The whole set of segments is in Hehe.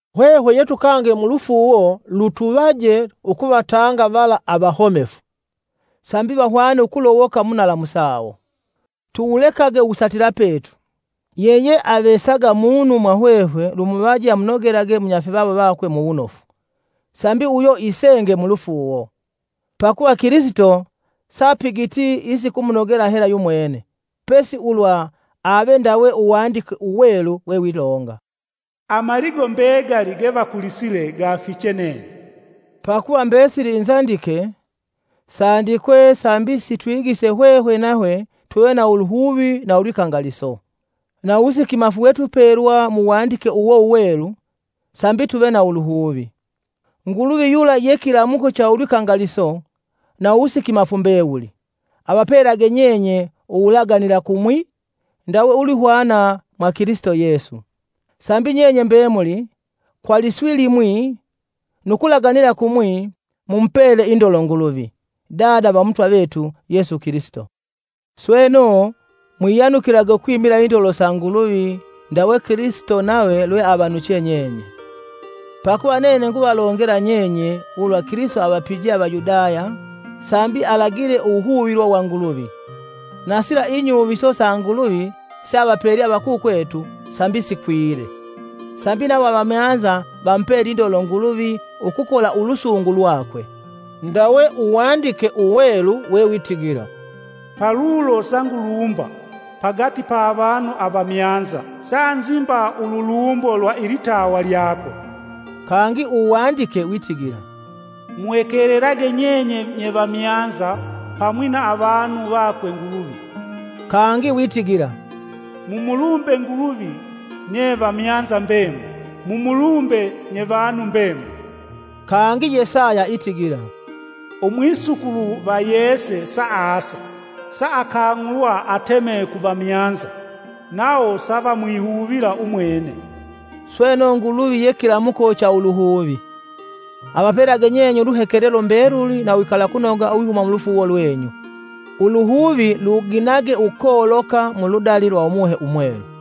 Hwehwe yetukange mulufuuwo lutuvaje ukuvatanga vala avahomefu, sambi vahwane ukulowoka mu nalamu sawo. Tuwulekage uwusatila petu. Yeyeavesaga munu mwa hwehwe lumuvaje amunogelage munyafivawo vakwe muwunofu, sambi uyo isenge mulufuuwo. Pakuva Kilisito sapigiti isikumunogela hela yumwene, Pesi ulwa ave ndawe Uwandike Uwelu wewilonga, “Amaligo mbegali gevakulisile gafiche nene.” Pakuva mbesili inzandike, sandikwe sambi sitwigise hwehwe nahwe tuve na uluhuvi na ulwikangaliso, na uwusikimafu wetwipelwa mu Wandike uwo Uwelu sambi tuve na uluhuvi. Nguluvi yula ye kilamuko cha ulwikangaliso na uwusikimafu mbewuli, avapelage nyenye uwulaganila kumwi ndawe ulwihwana mwa Kilisito Yesu, sambi nyenye mbemuli, kwa liswi limwi nu kulaganila kumwi mumupele indolo Nguluvi, Dada va Umutwa vetu Yesu Kilisito. Sweno, mwiyanukilage ukwimila indolo sa Nguluvi ndawe Kilisito nave lweavanuche nyenye. Pakuva nene nguvalongela nyenye ulwa Kilisito avapijee Avayudaya sambi alagile uwuhuvilwa wa Nguluvi, na sila inyuviso sa Nguluvi seavapelye avakukwetu sambi sikwile, sambi nawo avamyanza vamupele indolo Nguluvi ukukola ulusungu lwakwe. Ndawe Uwandike Uwelu wewitigila: “Palulo sangulumba, pagati pa avanu avamyanza sa nzimba ululumbo lwa ilitawa lyako.” Kangi Uwandike witigila: “Muhekelelage nyenye nye vamyanza pamwi na avanu vakwe Nguluvi.” Kangi witigila: “Mumulumbe Nguluvi, nye vamyanza mbemuli; mumulumbe, nye vanu mbemuli.” Kangi Yesaya itigila: “Umwisukulu va Yese saasa, saakang'ulwa ateme ku vamyanza; nawo savamwihuvila umwene.” Sweno Nguluvi ye kilamuko cha uluhuvi, avapelage nyeye uluhekelelo mbeluli na uwikalakunoga uwihuma mulufuuwo lwenyu, uluhuvi luginage ukoloka muludali lwa Umuhe Umwelu.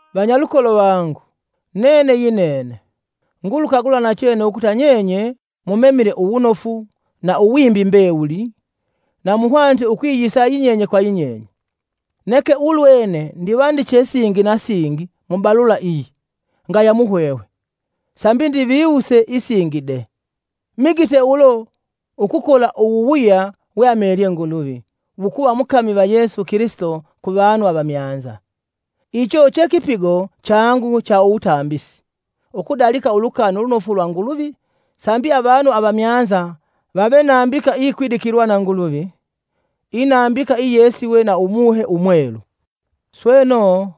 Vanyalukolo vangu, nene yinene, ngulukagula nachene ukuta nyenye mumemile uwunofu, na uwimbi mbewuli, na muhwanite ukwiyisa yinyenye kwa yinyenye. Neke ulwene ndivandiche singi na singi mu balula iyi ngaya muhwehwe, sambi ndiviwuse isingi de. Migite ulo ukukola uwuwuya weamelye Nguluvi wukuva mukami va Yesu Kilisito kuvanu avamyanza. Icho che kipigo changu cha uwutambisi, ukudalika Ulukani Ulunofu lwa Nguluvi sambi avanu avamyanza vave nambika iyikwidikilwa na Nguluvi, inambika iyesiwe na Umuhe Umwelu. Sweno,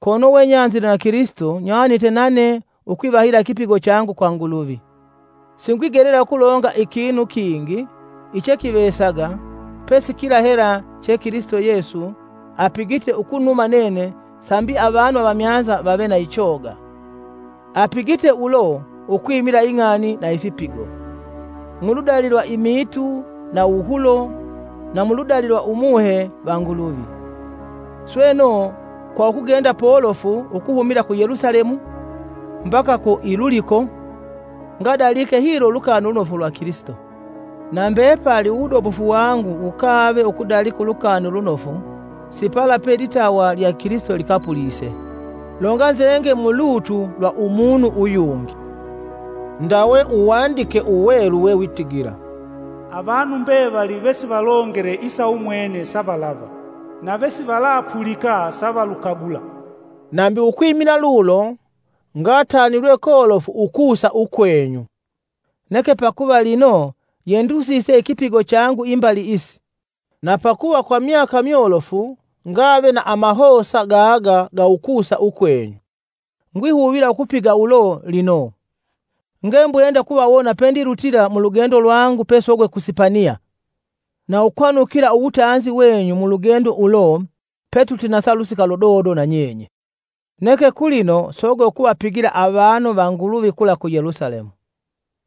kono wenyanzile na Kilisito nywanite nane ukwivahila ikipigo changu kwa Nguluvi. Singwigelela ukulonga ikinu kingi ichekivesaga pesi kila hela che Kilisito Yesu apigite ukunuma nene sambi avanu avamyanza vave na ichoga. Apigite ulo ukwimila ing'ani na ifipigo. Muludali lwa imiitu na uwuhulo na muludali lwa Umuhe va Nguluvi. Sweno, kwa ukugenda polofu ukuhumila ku Yelusalemu mbaka ku Iluliko, ngadalike hilo Ulukani Ulunofu lwa Kilisito. Na mbepali uwudobofu wangu wukave ukudalika Ulukani Ulunofu si pala pe ilitawa lya Kilisito likapulise, longanzenge mu lutu lwa umunu uyungi. Ndawe Uwandike Uwelu wewitigila: “Avanu mbevali vesivalongele isa umwene savalava. Na vesivalapulika, savalukagula.” Nambi ukwimila lulo, ngatanilwe kolofu ukusa ukwenyu. Neke pakuva lino yendusise ikipigo changu imbali isi, na pakuva kwa myaka myolofu ngave na amahosa gaga ga ukusa ukwenyu, ngwihuvila ukupiga ulo lino. Ngembwenda ukuvawona pendilutila mulugendo lwangu pesogwe ku Sipaniya na ukwanukila uwutanzi wenyu mulugendo ulo petutinasa kwa pelusika ludodo na nyenye. Neke, kulino sogwe ukuvapigila avanu va Nguluvi kula ku Yelusalemu.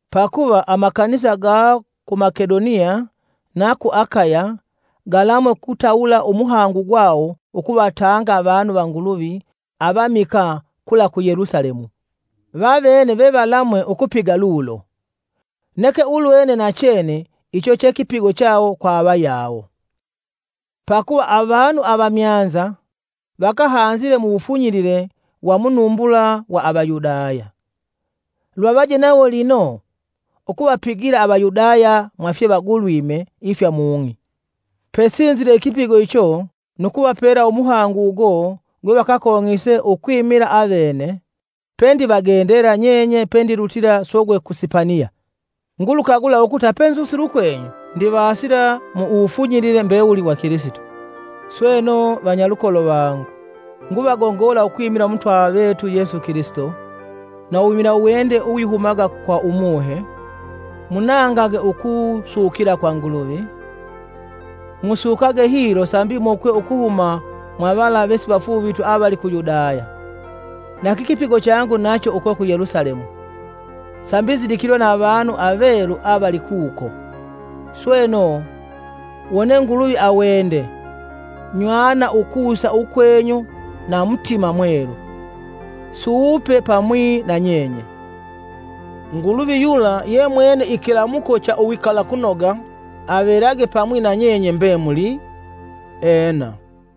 Pakuva amakanisa ga ku Makedoniya na ku Akaya galamwe ukutawula umuhangu gwawo ukuvatanga avanu va Nguluvi avamikaa kula ku Yelusalemu. Vavene vevalamwee ukupiga lulo, neke ulwene nachene icho che kipigo chawo kwa avayawo. Pakuva avanu avamyanza vakahanzile mu wufunyilile wa munumbula wa Avayudaya, luvavaje nawo lino ukuvapigila Avayudaya mwa fyevagulwime ifya mung'i. Pesinzile ikipigo icho nu kuvapela umuhangu ugo gwevakakong'ise ukwimila avene, pendivagendela nyenye pendilutila sogwe ku Sipaniya. Ngulukagula ukuta penzusile ukwenyu ndivasila mu uwufunyilile mbewuli wa Kilisito. Sweno, vanyalukolo vangu, nguvagongola ukwimila Umutwa vetu Yesu Kilisito, na uwimila uwende uwihumaga kwa Umuhe, munangage ukusukila kwa Nguluvi. Musukage hilo sambi mokwe ukuhuma mwa vala vesivafuuvitwi avali ku Yudaya, na kikipigo changu nacho uko ku Yelusalemu, sambi nzidikilwe na avanu avelu avali kuko. Sweno, wone Nguluvi awende, nywana ukusa ukwenyu na mutima mwelu, suupe pamwi na nyenye. Nguluvi yula yemwene ikilamuko cha uwikalakunoga avelage na pamwi na nyenye mbemuli! Ena!